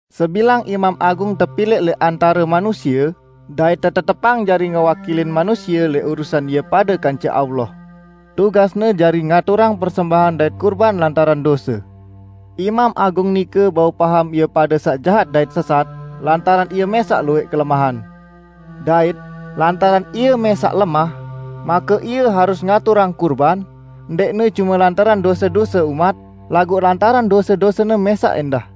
Sebilang Imam Agung tepilẽq lẽq antare manusie, dait tetetepang jari ngewakilin manusie lẽq urusan ie pade kance Allah. Tugasne jari ngaturang persembahan dait kurban lantaran dose. Imam Agung nike bau paham ie pade saq jahat dait sesat, lantaran ie mẽsaq luwẽq kelemahan. Dait, lantaran ie mẽsaq lemah, make ie harus ngaturang kurban, ndẽqne cume lantaran dose-dose umat, laguq lantaran dose-dosene mẽsaq ẽndah.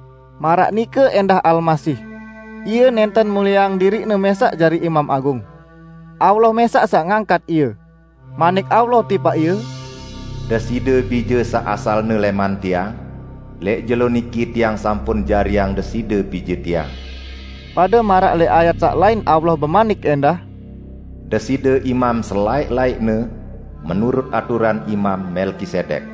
Maraq nike ẽndah Almasih. Ie nẽnten mulieang diriq-Ne mẽsaq jari Imam Agung. Allah mẽsaq saq ngangkat Ie. Manik Allah tipaq Ie, "Deside Bije saq asalne lẽman Tiang, lẽq jelo niki Tiang sampun jariang Deside Bije Tiang." Pade maraq lẽq ayat saq lain Allah bemanik ẽndah, "Deside Imam selaẽq-laẽqne, menurut aturan Imam Melkisedek."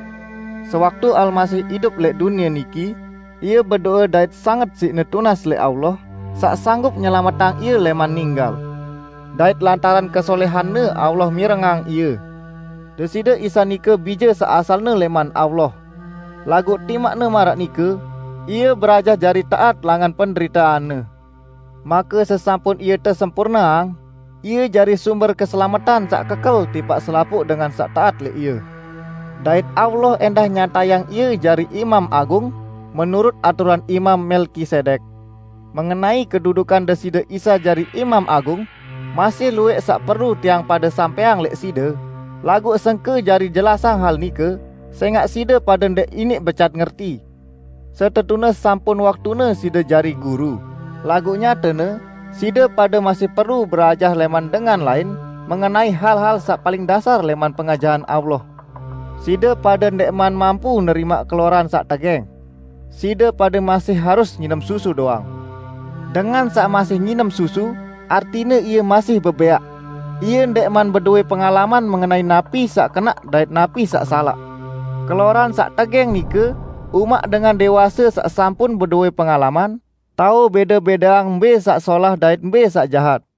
Sewaktu Almasih idup lẽq dunie niki, Ie bedo'e dait sanget siq-Ne tunas lẽq Allah, saq sanggup nyelametang Ie lẽman ninggal. Dait lantaran kesolẽhan-Ne Allah mirengang Ie. Deside Isa nike Bije saq asalne lẽman Allah, laguq timaqne maraq nike, Ie berajah jari taat langan penderitean-Ne. Make sesampun Ie tesempurneang, Ie jari sumber keselametan saq kekel tipaq selapuq dengan saq taat lẽq Ie, dait Allah ẽndah nyatayang Ie jari Imam Agung, menurut aturan Imam Melkisedek. Mengenai kedudukan Deside Isa jari Imam Agung, masih luwẽq saq perlu tiang pade sampẽang lẽq side, laguq sengke jari jelasang hal nike, sẽngaq side pade ndẽq iniq becat ngerti. Setetune sampun waktune side jari guru, laguq nyatene side pade masih perlu berajah lẽman dengan lain mengenai hal-hal saq paling dasar lẽman pengajahan Allah. Side pade ndẽqman mampu nerimaq keloran saq tegẽng; side pade masih harus nginem susu doang. Dengan saq masih nginem susu, artine ie masih bebẽaq; ie ndẽqman bedowẽ pengalaman mengenai napi saq kenaq dait napi saq salaq. Keloran saq tegẽng nike umaq dengan dẽwase saq sampun bedowẽ pengalaman, tao bẽde-bẽdeang mbẽ saq solah dait mbẽ saq jahat.